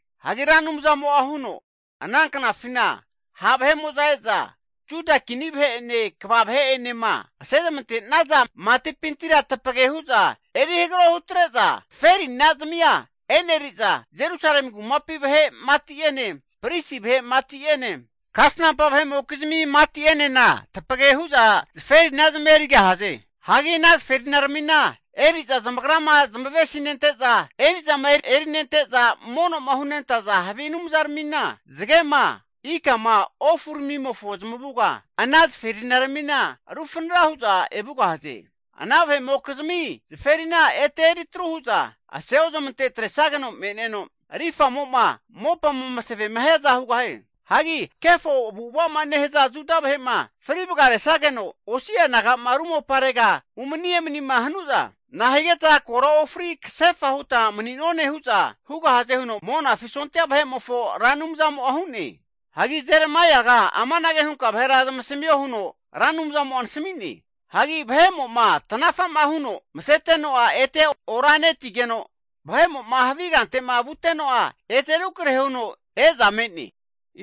Hagi Ra Anumzamo'a huno, Ana knafina ha' vahe'mo'za eza Juda kini vahe'ene kva vahe'enema asezamante'naza matipintira tapage huza eri hagaro hutre'za zaferina zamia e'neri'za, Jerusalemi kumapi vahe' mati'ene, pristi vahe' mati'ene, kasanampa vahe'mokizmi mati'enena tapage hu'za zaferinazamia erigahaze. Hagi ana zaferinaramina eri'za zamagrama zamavesi nente'za eri'zama erinente'za mono'ma hunentaza havi anumzaramina, zagema, ikama, ofuramimofo zamavuga ana zaferinaramina rufanara huza evugahaze. Ana vahe'mokizmi zaferina ete eri tru hu'za aseozamante atresageno me'neno rifamo'ma mopama eri masavema hiaza hugahie. Hagi kefo avu'ava'ma nehaza Juda vahe'ma fri vagaresageno osi'a naga'ma ru moparega umani emanima hanuza, nahigeta kora ofari kasefa huta mani'none, hu'za hugahaze huno Monafi sondia vahe'mofo Ra Anumzamo'a hu'ne. Hagi Jeremaiaga amanage hunka vahera zamasamio huno Ra Anumzamo'a nasami'ne. Hagi vahe'mo'ma tanafa'ma huno maseteno'a ete ora netigeno, vahe'mo'ma havi kante'ma vuteno'a ete rukrahe huno eza me'ne.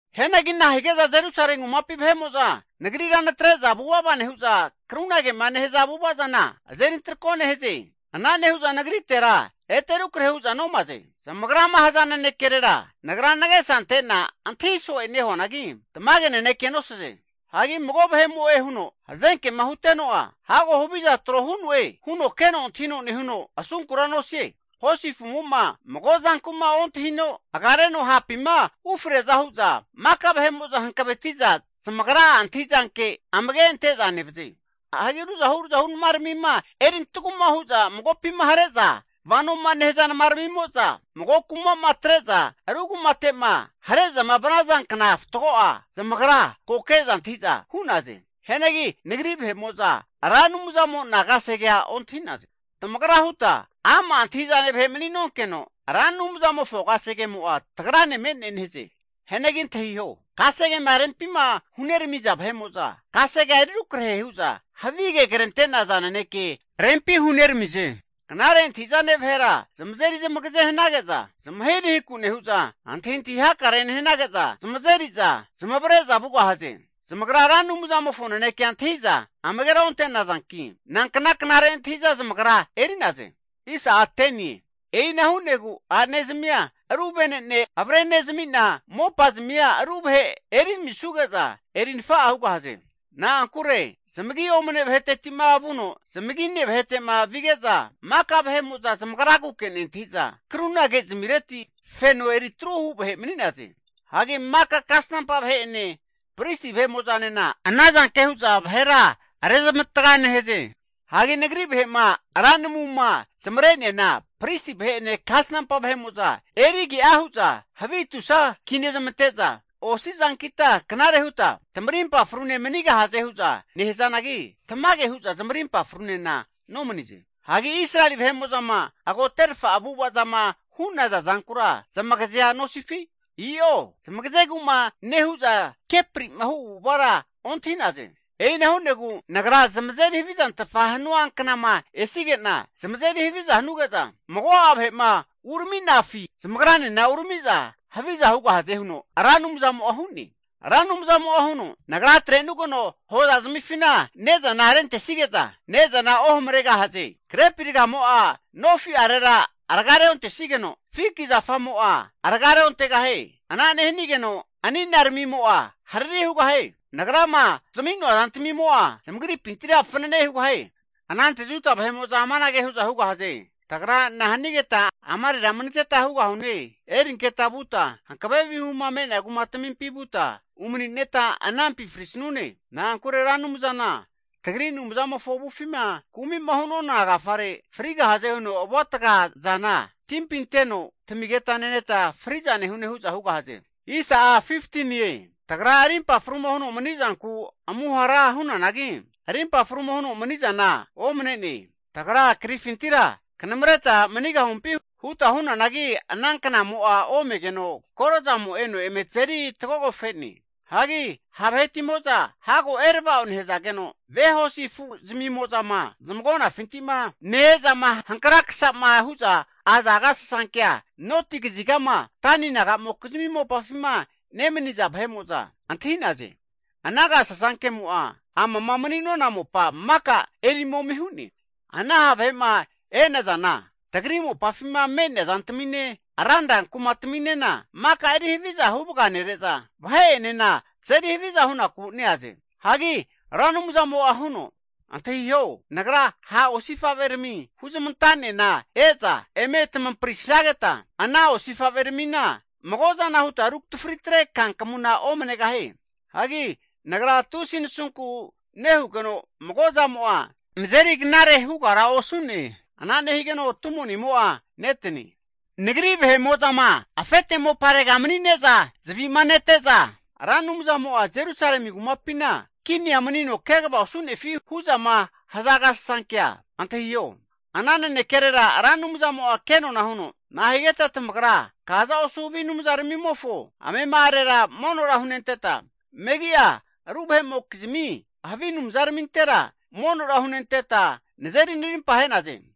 Hianagi na'a hige'za Jerusalemi kumapi vahe'mo'za Nagrira natre'za vuvava nehu'za, krunagema nehaza avu'ava zana azerintrako nehaze? Ana nehu'za Nagritera ete rukrahe hu'za nomaze. Zamagrama haza nanekerera Nagra nagesa ante'na antahi so'e nehuanagi, tamage nanekea nosaze. Hagi mago vahe'mo'e huno hazenkema huteno'a, hago haviza tro hu'noe huno keno antahino nehuno asunkura nosie. Hosi afu'mo'ma mago zanku'ma ontahino agareno hapima ufreaza hu'za, maka vahe'mo'za hankaveti'za zamagra'a antahi'zanke amage ante'za nevaze. Hagi ruzahu ruzahu namaramima, erintaguma hu'za magopima hare'za vanoma nehaza namaramimo'za, mago kuma'ma atre'za ru kumate'ma hare'zama vanaza kna fatgo'a zamagra ko ke'za antahi'za hu'naze. Hianagi Nagri vahe'mo'za Ra Anumzamo'na kasegea ontahi'naze. Tamagra huta, ama' antahi'zane vahe mani'nonkeno, Ra Anumzamofo kasegemo'a tagrane me'ne nehaze. Hianagi antahiho, kasegema rempima huneramiza vahe'mo'za, kasegea eri rukrahe hu'za havige krente'naza naneke rempi huneramize. Knare antahi'zane vahera zamazeri zamagaze hanage'za zamahirahiku nehu'za antahintahi hakare nehanage'za, zamazeri'za zamavare'za vugahaze. Zamagra Ra Anumzamofo nanekea antahi'za amagera onte'nazanki, nankna knare antahi'za zamagra eri'naze? E'ina hu'negu a'nezamia ru vene'ne avrenezami'na, mopa zamia ru vahe eri zamisuge'za eri nafa'a hugahaze. Na'ankure zamagi omane vaheteti'ma vuno zamagine vahete'ma vige'za, maka vahe'mo'za zamagraguke nentahi'za kruna, kezmireti feno eri truhu vahe mani'naze. Hagi maka kasnampa vahe'ene pristi vahe'mo'zanena ana zanke hu'za vahera rezamatga nehaze. Hagi Nagri vahe'ma ra namuma zamare'neana pristi vahe'ene kasnampa vahe'mo'za eri age'a hu'za havi tusa kinezmante'za osi zankita knare huta tamarimpa frune manigahaze hu'za nehazanagi, tamage hu'za zamarimpa frunena nomanize. Hagi Israeli vahe'mo'zama agoterfa avu'ava zama hu'naza zankura zamagazea nosifi? I'o zamagazegu'ma nehu'za kepri'ma hu avu'avara ontahi'naze. E'ina hu'negu Nagra zamazeri havizantfama hanua knama esige'na, zamazeri haviza hanuge'za mago'a vahe'ma urami'nafi zamagra'enena urami'za haviza hugahaze huno Ra Anumzamo'a hu'ne. Ra Anumzamo'a huno, Nagra atre'nugeno hoza zamifina ne'zana rentesige'za ne'zana ohamaregahaze. Grepi ragamo'a nofi'arera raga reontesigeno, fiki zafamo'a raga re'ontegahie. Ana nehanigeno ani'na ramimo'a harari hugahie. Nagrama zami'noa zantamimo'a zamagripintira fanane hugahaze. Anante Juda vahe'mo'za amanage hu'za hugahaze. Tagra nahanigeta amarera maniteta hugahune? Erinketa vuta hankave vihuma me'nea kumatamimpi vuta umanineta anampi frisanune. Na'ankure Ra Anumzana tagri Anumzamofo avufima kumi'ma hu'nona agafare, frigahaze huno avuataga zana timpi anteno tamigeta neneta fri'za nehune hu'za hugahaze. Tagra arimpa fruma huno manizanku amuhara hunanagi, arimpa fruma huno mani'zana omane'ne. Tagra krifintira kanamareta manigahumpi huta hunanagi, ana knamo'a omegeno koro zamo eno eme tazeri tagogofe'ne. Hagi ha' vahetimo'za hago erava'o nehazageno, ve hosi afu zamimo'zama zamagonafinti'ma ne-ezama hankra kasa'ma hu'za aza agasasankea noti kazigama Dani nagamokizmi mopafima nemaniza vahe'mo'za antahi'naze. Ana agasasankemo'a amama mani'nona mopa maka eri momi hu'ne. Ana ha' vahe'ma e'nazana tagri mopafima me'nea zantamine ranra kumataminena maka eri haviza huvaga nere'za vahe'enena tazeri haviza hunaku neaze. Hagi Ra Anumzamo'a huno, antahiho, Nagra ha' osifa'verami huzamanta'nena e'za eme tamamparisageta ana osifa'veramina mago zana huta rutafritre kankamuna omanegahie. Hagi nagra tusi nasunku nehugeno mago zamo'a nazeri knare hugara osu'ne. Ana nehigeno tumonimo'a netane. Nagri vahe'mo'zama afete moparega mani'neza zavi'ma nete'za Ra Anumzamo'a Jerusalemi kumapina kinia manino kegava osu'nefi hu'zama haza agasasankea antahiho. Ana nanekerera Ra Anumzamo'a kenona huno, Nahigeta tamagra kaza osu havi anumzaramimofo amema'arera monora hunenteta, megi'a ru vahe'mokizmi havi anumzaramintera monora hunenteta nazeri narimpa ahe'naze?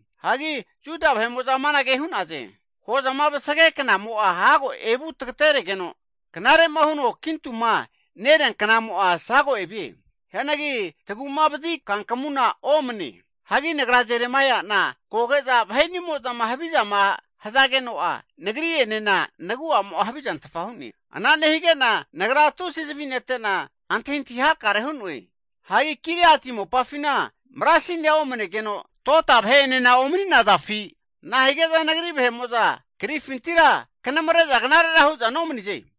Hagi Juda vahe'mo'za amanage hu'naze. Hozama vasage knamo'a hago evu tagateregeno, knare'ma huno kintuma nerea knamo'a sago evie. Hianagi tagu'ma vazi kankamuna omane. Hagi nagra Jeremaia'na, koge'za vahe'nimozama havizama hazageno'a nagri'enena nagu'amo'a havizantfa hu'ne. Ana nehige'na nagra tusi zavi nete'na antahintahi hakare hu'noe. Hagi Gileati mopafina marasinia omanegeno tota vahe'enena omani'nazafi? Nahige'za nagri vahe'mo'za karifintira kanamare'za knarera hu'za nomanize?